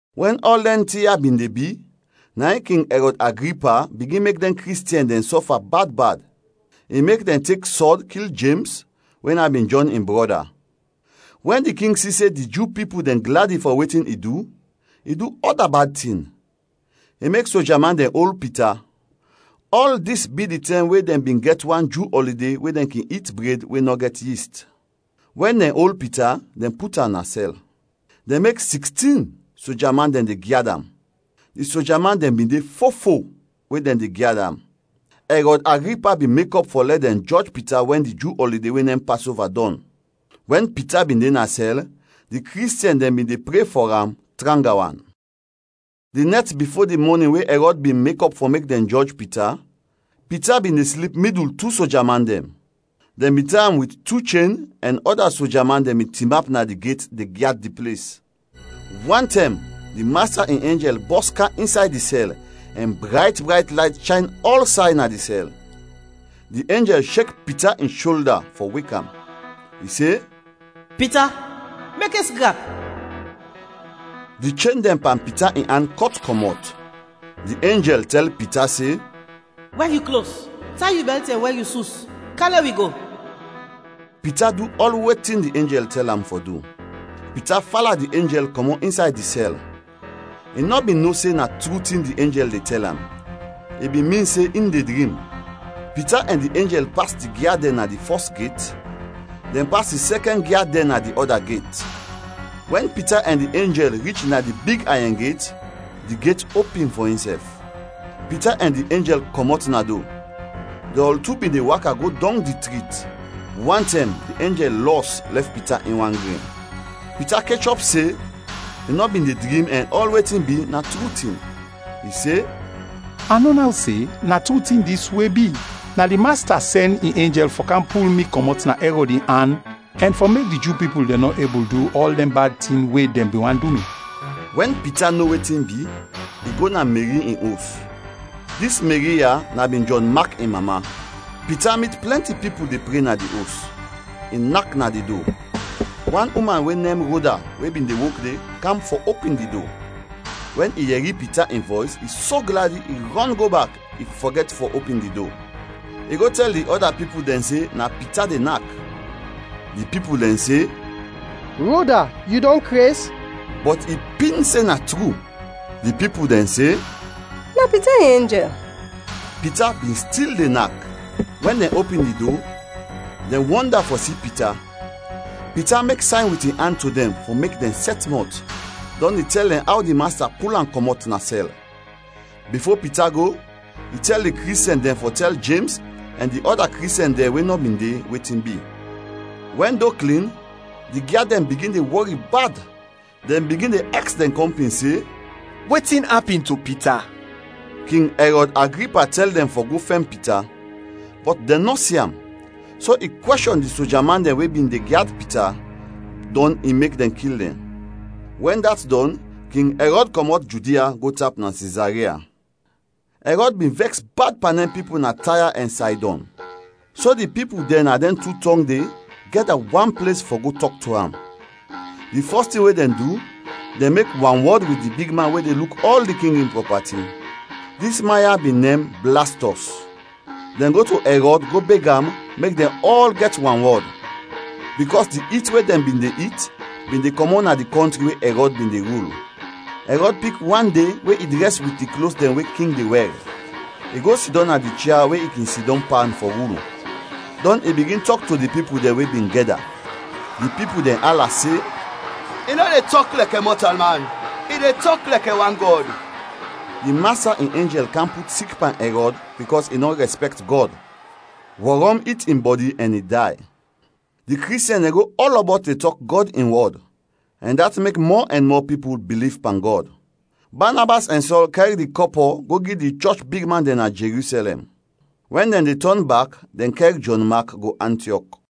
Wɛn ɔl dɛn tin ya bin de bi, na in King Ɛrɔd Agripa bigin mek dɛn Kristiɛn dɛn sɔfa bad bad. I mek dɛn tek sɔd kil Jems we na bin Jɔn in brɔda. Wɛn di king si se di Ju pipul dɛn gladi fɔ wetin i du, i du ɔda bad tin; i mek soja man dɛn ol Pita. Ɔl dis bi di tɛm we dɛn bin gɛt wan Ju ɔlide we dɛn kin it bred we nɔ gɛt yist. Wɛn dɛn ol Pita, dɛn put am na sɛl. Dɛn mek sikstin soja man dɛn de gyad am; di soja man dɛn bin de fo-fo we dɛn de gyad am. Ɛrɔd Agripa bin mekɔp fɔ lɛ dɛn jɔj Pita wɛn di Ju ɔlide we nem Pasova dɔn. Wɛn Pita bin de na sɛl, di Kristiɛn dɛn bin de pre fɔ am tranga wan. Di nɛt bifo di mɔnin we Ɛrɔd bin mekɔp fɔ mek dɛn jɔj Pita, Pita bin de slip midul tu soja man dɛn. Dɛn bin tay am wit tu chen ɛn ɔda soja man dɛn bin tinap na di get de gyad di ples. Wantɛm, di Masta in enjɛl bɔs kam insay di sɛl ɛn brayt brayt layt shayn ɔlsay na di sɛl. Di enjɛl shek Pita in sholda fɔ wek am. I se, “Pita, mekes grap!” Di chen dɛn pan Pita in an kɔt kɔmɔt. Di enjɛl tɛl Pita se, “Wɛr yu klos, tay yu bɛlt, ɛn wɛr yu sus. Kam lɛ wi go.” Pita du ɔl wetin di enjɛl tɛl am fɔ du. Pita fala di enjɛl kɔmɔt insay di sɛl. I nɔ bin no se na tru tin di enjɛl de tɛl am, i bin min se in de drim. Pita ɛn di enjɛl pas di gyad dɛn na di fɔs get, dɛn pas di sɛkɛn gyad dɛn na di ɔda get. Wɛn Pita ɛn di enjɛl rich na di big ayɛn get, di get opin fɔ insɛf. Pita ɛn di enjɛl kɔmɔt na do. Dɛn ɔl tu bin de waka go dɔng di trit; wantɛm, di enjɛl lɔs lɛf Pita in wan gren. Pita kechɔp se i nɔ bin de drim ɛn ɔl wetin bi na tru tin. I se, “A no naw se na tru tin dis we bi! Na di Masta sɛn in enjɛl fɔ kam pul mi kɔmɔt na Ɛrɔd in an ɛn fɔ mek di Ju pipul dɛn nɔ ebul du ɔl dɛn bad tin we dɛn bin want du mi.” Wɛn Pita no wetin bi, i go na Meri in os. Dis Meri ya na bin Jɔn Mak in mama. Pita mit plɛnti pipul de pre na di os. I nak na di do; wan uman we nem Roda we bin de wok de, kam fɔ opin di do. Wɛn i yɛri Pita in vɔys, i so gladi, i rɔn go bak, i fɔgɛt fɔ opin di do. I go tɛl di ɔda pipul dɛn se na Pita de nak. Di pipul dɛn se, “Roda, yu dɔn kres!” Bɔt i pin se na tru. Di pipul dɛn se, “Na Pita in enjɛl.” Pita bin stil de nak; wɛn dɛn opin di do, dɛn wɔnda fɔ si Pita. Pita mek sayn wit in an to dɛn fɔ mek dɛn sɛt mɔt, dɔn i tɛl dɛn aw di Masta pul am kɔmɔt na sɛl. Bifo Pita go, i tɛl di Kristiɛn dɛn fɔ tɛl Jems ɛn di ɔda Kristiɛn dɛn we nɔ bin de, wetin bi. Wɛn do klin, di gyad dɛn bigin de wɔri bad, dɛn bigin de aks dɛn kɔmpin se, “Wetin apin to Pita?” King Ɛrɔd Agripa tɛl dɛn fɔ go fɛn Pita, bɔt dɛn nɔ si am, so i kwɛshɔn di soja man dɛn we bin de gyad Pita, dɔn i mek dɛn kil dɛn. Wɛn dat dɔn, King Ɛrɔd kɔmɔt Judia go tap na Sizaria. Ɛrɔd bin vɛks bad pan dɛn pipul na Taya ɛn Saydɔn, so di pipul dɛn na dɛn tu tɔng de gɛda wan ples fɔ go tɔk to am. Di fɔs tin we dɛn du, dɛn mek wanwɔd wit di bigman we de luk ɔl di king in prɔpati. Dis man ya bin nem Blastɔs. Dɛn go to Ɛrɔd go beg am mek dɛn ɔl gɛt wanwɔd, bikɔs di it we dɛn bin de it bin de kɔmɔt na di kɔntri we Ɛrɔd bin de rul. Ɛrɔd pik wan de we i drɛs wit di klos dɛn we king de wɛr. I go sidɔm na di chia we i kin sidɔm pan fɔ rul, dɔn i bigin tɔk to di pipul dɛn we bin gɛda. Di pipul dɛn ala se, “I nɔ de tɔk lɛkɛ mɔtalman, i de tɔk lɛkɛ wan gɔd!” Di Masta in enjɛl kam put sik pan Ɛrɔd bikɔs i nɔ rɛspɛkt Gɔd; wɔrɔm it in bɔdi ɛn i day. Di Kristiɛn dɛn go ɔlɔbɔt de tɔk Gɔd in wɔd ɛn dat mek mɔ ɛn mɔ pipul biliv pan Gɔd. Banabas ɛn Sɔl kɛr di kɔpɔ go gi di chɔch bigman dɛn na Jerusɛlɛm. Wɛn dɛn de tɔn bak, dɛn kɛr Jɔn Mak go Antiɔk.